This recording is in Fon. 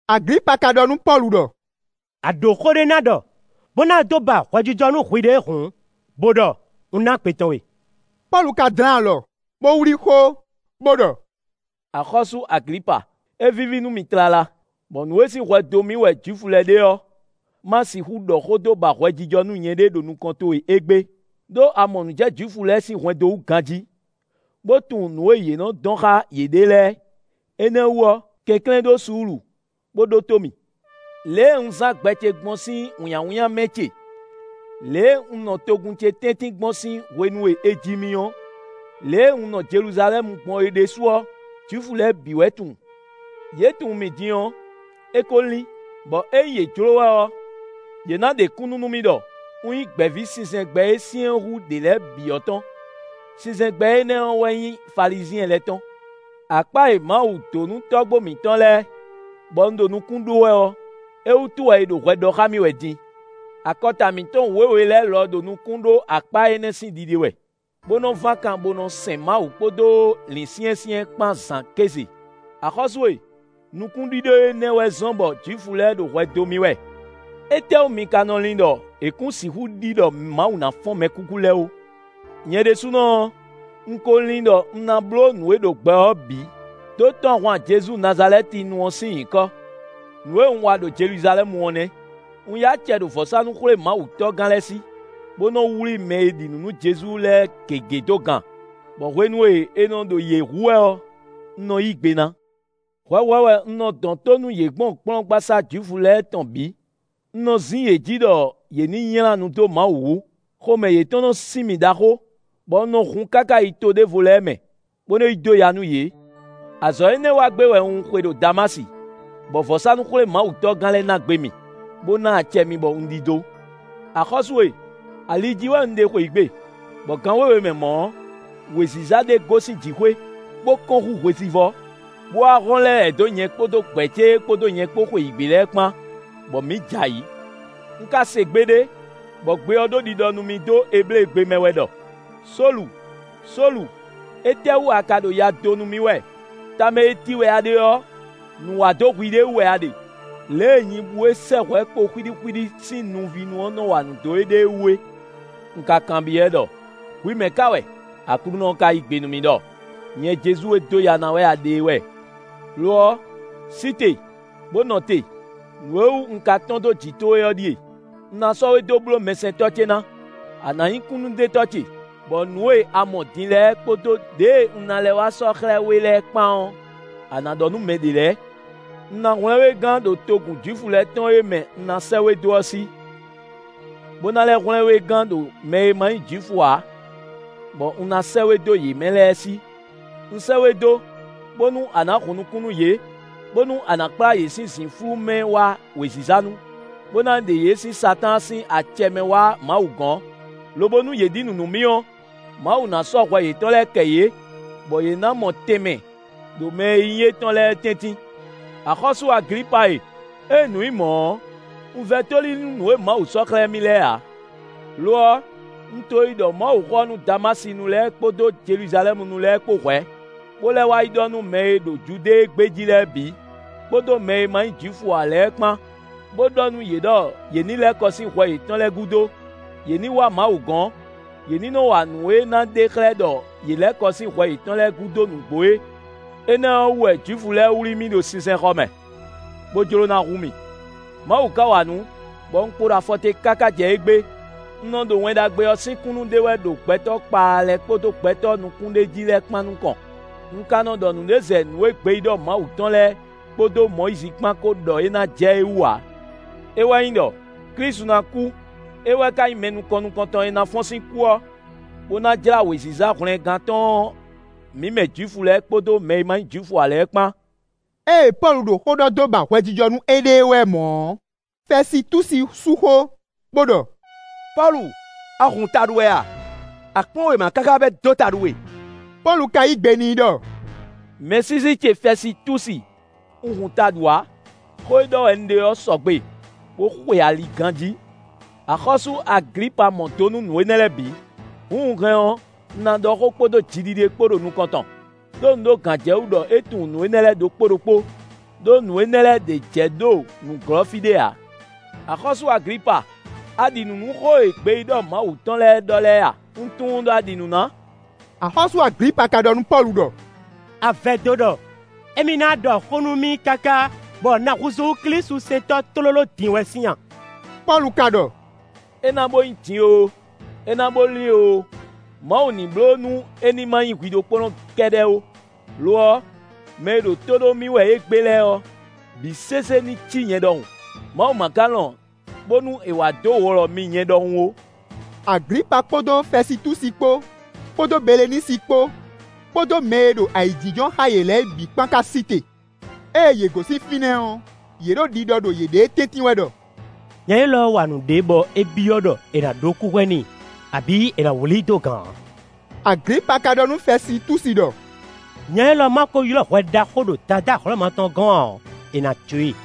Aglipa ka ɖɔ nú Pɔ́lu ɖɔ: “A ɖó xó ɖé ná ɖɔ, bó ná dó ba hwɛjijɔ nú hwiɖée hǔn, bó ɖɔ; un ná gbe tɔn we.” Pɔ́lu ka dlɛ́n alɔ, bó wlí xó, bó ɖɔ: “Axɔ́sú Aglipa, é víví nú mì tlala, bɔ nǔ e sín hwɛ dó mì wɛ Jwifu lɛ́ɛ ɖe ɔ́, má sixú ɖɔ xó dó ba hwɛjijɔ nú nyɛɖée ɖo nukɔn towe égbé; ɖó a mɔ nǔ jɛ Jwifu lɛ́ɛ sín hwɛndo wú ganjí, bó tunwun nǔ e yě nɔ dɔn xá yěɖée lɛ́ɛ. Énɛ́ wú ɔ́, kɛnklɛ́n ɖǒ suúlu, bó ɖótó mì. “Lě e un zán gbɛ ce gbɔn sín wǐnnyáwínnyá mɛ ce, lě e un nɔ togun ce tɛ́ntin gbɔn sín hwenu e è ji mì ɔ́, lě e un nɔ Jeluzalɛ́mu gbɔn é ɖésú ɔ́, Jwifu lɛ́ɛ bǐ wɛ tunwun. Yě tunwun mì din ɔ́, é ko lín, bɔ ényí yě jló wɛ ɔ́, yě ná ɖe kúnnu nú mì ɖɔ un nyí gbɛ̌ví sinsɛngbɛ́ e syɛ́n hú ɖě lɛ́ɛ bǐ ɔ́ tɔn. Sinsɛngbɛ́ énɛ́ ɔ́ wɛ nyí Falizyɛn lɛ́ɛ tɔn. Akpá e Mawu dó nú tɔ́gbó mǐtɔn lɛ́ɛ, bɔ un ɖo nukún ɖó wɛ ɔ́, é wútu wɛ è ɖo hwɛ ɖɔ xá mì wɛ din. Akɔta mǐtɔn wěwe lɛ́ɛ lɔ ɖo nukún ɖó akpá énɛ́ sín ɖiɖe wɛ, bó nɔ́ ván kan bó nɔ́ sɛn Mawu kpódó lǐnsyɛ́nsyɛ́n kpán zǎn kéze. Axɔ́sú e! Nukúnɖíɖó énɛ́ wɛ zɔ́n bɔ Jwifu lɛ́ɛ ɖo hwɛ dó mì wɛ. Étɛ́wú mi ka nɔ lin ɖɔ è kún sixú ɖi ɖɔ Mawu ná fɔ́n mɛkúkú lɛ́ɛ ó? “Nyɛ ɖésúnɔ ɔ́, un ko lin ɖɔ un ná bló nǔ e ɖo gbɛ ɔ́ bǐ, dó tɔ́n ahwan Jezu Nazalɛ́tinu ɔ́ sín nyǐkɔ. Nǔ e un wa ɖo Jeluzalɛ́mu ɔ́ nɛ́. Un yí acɛ ɖo vɔ̌sánú-xwlémawutɔ́gán lɛ́ɛ sí, bó nɔ wlí mɛ e ɖi nǔ nú Jezu lɛ́ɛ gěgé dó gan, bɔ hwenu e è nɔ ɖo yě hu wɛ ɔ́, un nɔ yí gbe ná. Hwɛhwɛ wɛ un nɔ dɔn tó nú yě gbɔn kplɔ́ngbasá Jwifu lɛ́ɛ tɔn bǐ; un nɔ zín yě jí ɖɔ yě ní nylá nu dó Mawu wú; xomɛ yětɔn nɔ sin mì ɖaxó, bɔ un nɔ hun káká yi to ɖěvo lɛ́ɛ mɛ, bó nɔ yi dó ya nú yě. “Azɔ̌ énɛ́ wa gbé wɛ un xwe ɖo Damási, bɔ vɔ̌sánú-xwlémawutɔ́gán lɛ́ɛ ná gbe mì, bó ná acɛ mì bɔ un ɖidó. Axɔ́sú e! Ali jí wɛ un ɖe xweyǐgbe, bɔ gan wěwe mɛ mɔ̌ ɔ́, wěziza ɖé gosín jǐxwé, bó kɔ́n hú hwesivɔ́, bó wá hɔ́n lɛ́ lɛ̌ dó nyɛ kpódó gbɛ̌ ce e kpódó nyɛ kpó xweyǐgbe lɛ́ɛ kpán, bɔ mǐ jɛ ayǐ. Un ka se gbe ɖé, bɔ gbe ɔ́ ɖo ɖiɖɔ nú mì dó Ebléegbe mɛ wɛ ɖɔ: ‘Sólu, Sólu, étɛ́wú a ka ɖo ya dó nú mì wɛ? Tamɛ e ti wɛ a ɖe ɔ́, nǔ wa dó hwiɖée wú wɛ a ɖe, lě e nyibú e sɛ́ hwɛ̌ kpo nuxwíɖíxwíɖí sín nuvínu ɔ́ nɔ́ wa nǔ dó éɖée wú é.’ Un ka kanbyɔ́ ɛ ɖɔ: ‘Hwi mɛ ka wɛ?’ Aklúnɔ ɔ́ ka yí gbe nú mì ɖɔ: ‘Nyɛ Jezu e dó ya ná wɛ a ɖe é wɛ. Lo ɔ́, sí te, bó nɔ te; nǔ e wú un ka tɔ́n dó jǐ towe ɔ́ ɖíe: un ná sɔ́ we dó bló mɛsɛntɔ́ ce ná; a nǎ nyí kúnnuɖetɔ́ ce, bɔ nǔ e a mɔ din lɛ́ɛ kpódó ɖěe un ná lɛ́ wá sɔ́ xlɛ́ we lɛ́ɛ kpán ɔ́, a nǎ ɖɔ nú mɛ ɖě lɛ́ɛ. Un ná hwlɛ́n we gán ɖo togun Jwifu lɛ́ɛ tɔn e mɛ un ná sɛ́ we dó ɔ́ sí, bó ná lɛ́ hwlɛ́n we gán ɖo mɛ e ma nyí Jwifu ǎ, bɔ un ná sɛ́ we dó yě mɛ lɛ́ɛ sí. Un sɛ́ we dó, bónú a nǎ hun nukún nú yě; bónú a nǎ kplá yě sín zǐnflú mɛ wá wěziza nu; bó ná ɖe yě sín Satáan sín acɛ mɛ wá Mawu gɔ́n, lobo nú yě ɖi nǔ nú mì ɔ́, Mawu ná sɔ́ hwɛ yětɔn lɛ́ɛ kɛ yě, bɔ yě ná mɔ tɛnmɛ ɖo mɛ e nyí étɔn lɛ́ɛ tɛ́ntin.’ “Axɔ́sú Aglipa e! Ée nǔ nyí mɔ̌ ɔ́, un vɛ́ tóli nú nǔ e Mawu sɔ́ xlɛ́ mì lɛ́ɛ ǎ. Lo ɔ́, un to yi ɖɔ Mawuxó ɔ́ nú Damásinu lɛ́ɛ kpódó Jeluzalɛ́munu lɛ́ɛ kpó hwɛ̌, bó lɛ́ wá yi ɖɔ nú mɛ e ɖo Judée gbé jí lɛ́ɛ bǐ, kpódó mɛ e ma nyí Jwifu ǎ lɛ́ɛ kpán, bó ɖɔ nú yě ɖɔ yě ní lɛ́ kɔ sín hwɛ yětɔn lɛ́ɛ gúdo; yě ní wá Mawu gɔ́n; yě ní nɔ wa nǔ e ná ɖe xlɛ́ ɖɔ yě lɛ́ kɔ sín hwɛ yětɔn lɛ́ɛ gúdo nǔgbó é. Énɛ́ ɔ́ wú wɛ Jwifu lɛ́ɛ wlí mì ɖo sinsɛnxɔ mɛ, bó jló ná hu mì. Mawu ka wa nǔ, bɔ un kpo ɖo afɔte káká jɛ égbé; un nɔ ɖo Wɛn Ɖagbe ɔ́ sín kúnnu ɖe wɛ ɖo gbɛtɔ́ kpaa lɛ́ɛ kpódó gbɛtɔ́ nukúnɖéjí lɛ́ɛ kpán nukɔn; un ka nɔ ɖɔ nǔɖé zɛ nǔ e gbeyíɖɔ Mawu tɔn lɛ́ɛ kpódó Mɔyízi kpán ko ɖɔ é ná jɛ é wú ǎ; é wɛ nyí ɖɔ: Klísu ná kú; é wɛ ka nyí mɛ nukɔn nukɔntɔn e ná fɔ́n sín kú ɔ́, bó ná jlá wěziza hwlɛngán tɔn ɔ́ mǐ mɛ Jwifu lɛ́ɛ kpódó mɛ e ma nyí Jwifu ǎ lɛ́ɛ kpán.” Ée Pɔ́lu ɖo xó ɖɔ dó ba hwɛjijɔ nú éɖée wɛ mɔ̌ ɔ́, Fɛsitúsi sú xó, bó ɖɔ: “Pɔ́lu! A hun taɖu wɛ a? A kplɔ́n wěma káká bɔ é dó taɖu we!” Pɔ́lu ka yí gbe n'i ɖɔ: “Mɛsísí ce Fɛsitúsi, un hun taɖu ǎ; xó e ɖɔ wɛ un ɖe ɔ́ sɔgbe, bó xwe ali ganjí. Axɔ́sú Aglipa mɔ do nú nǔ énɛ́ lɛ́ɛ bǐ; hǔn un hɛn ɔ́, un ná ɖɔ xó kpódó jiɖiɖe kpó ɖo nukɔn tɔn; ɖó un ɖó gǎnjɛwú ɖɔ é tunwun nǔ énɛ́ lɛ́ɛ ɖokpó ɖokpó, ɖó nǔ énɛ́ lɛ́ɛ ɖě jɛ ɖo nǔglɔ́ fí ɖé ǎ. Axɔ́sú Aglipa! A ɖi nǔ nú xó e gbeyíɖɔ Mawu tɔn lɛ́ɛ ɖɔ lɛ́ɛ a? Un tunwun ɖɔ a ɖi nǔ ná.” Axɔ́sú Aglipa ka ɖɔ nú Pɔ́lu ɖɔ: “A vɛdó ɖɔ émí ná ɖɔ xó nú mì káká bɔ un ná húzú klísusɛntɔ́ tlóló din wɛ sín a?” Pɔ́lu ka ɖɔ: “É ná bó nyí din oo, é ná bo lín oo, Mawu ní bló nú é ní ma nyí hwi ɖokpónɔ kɛ́ɖɛ́ ó; lo ɔ́, mɛ e ɖo tó ɖó mì wɛ égbé lɛ́ɛ ɔ́, bǐ sésé ní cí nyɛ ɖɔhun; Mawu ma ka lɔn bónú è wá dó wlɔ mi nyɛ ɖɔhun ó.” Aglipa kpódó Fɛsitúsi kpó, kpódó Belenísi kpó, kpódó mɛ e ɖo ayǐjínjɔ́n xá yě lɛ́ɛ bǐ kpán ka sí te. Ée yě gosín fínɛ́ ɔ́, yě ɖo ɖiɖɔ ɖo yěɖée tɛ́ntin wɛ ɖɔ: “Nya élɔ́ wa nǔɖé, bɔ é byɔ́ ɖɔ è nǎ ɖó kúhwɛ n'i, abǐ è nǎ wlí i dó gan ǎ.” Aglipa ka ɖɔ nú Fɛsitúsi ɖɔ: “Nya élɔ́ ma ko ylɔ́ hwɛ ɖaxó ɖo Dadá Hlɔ̌ma tɔn gɔ́n ǎ ɔ́, è nǎ jó e.”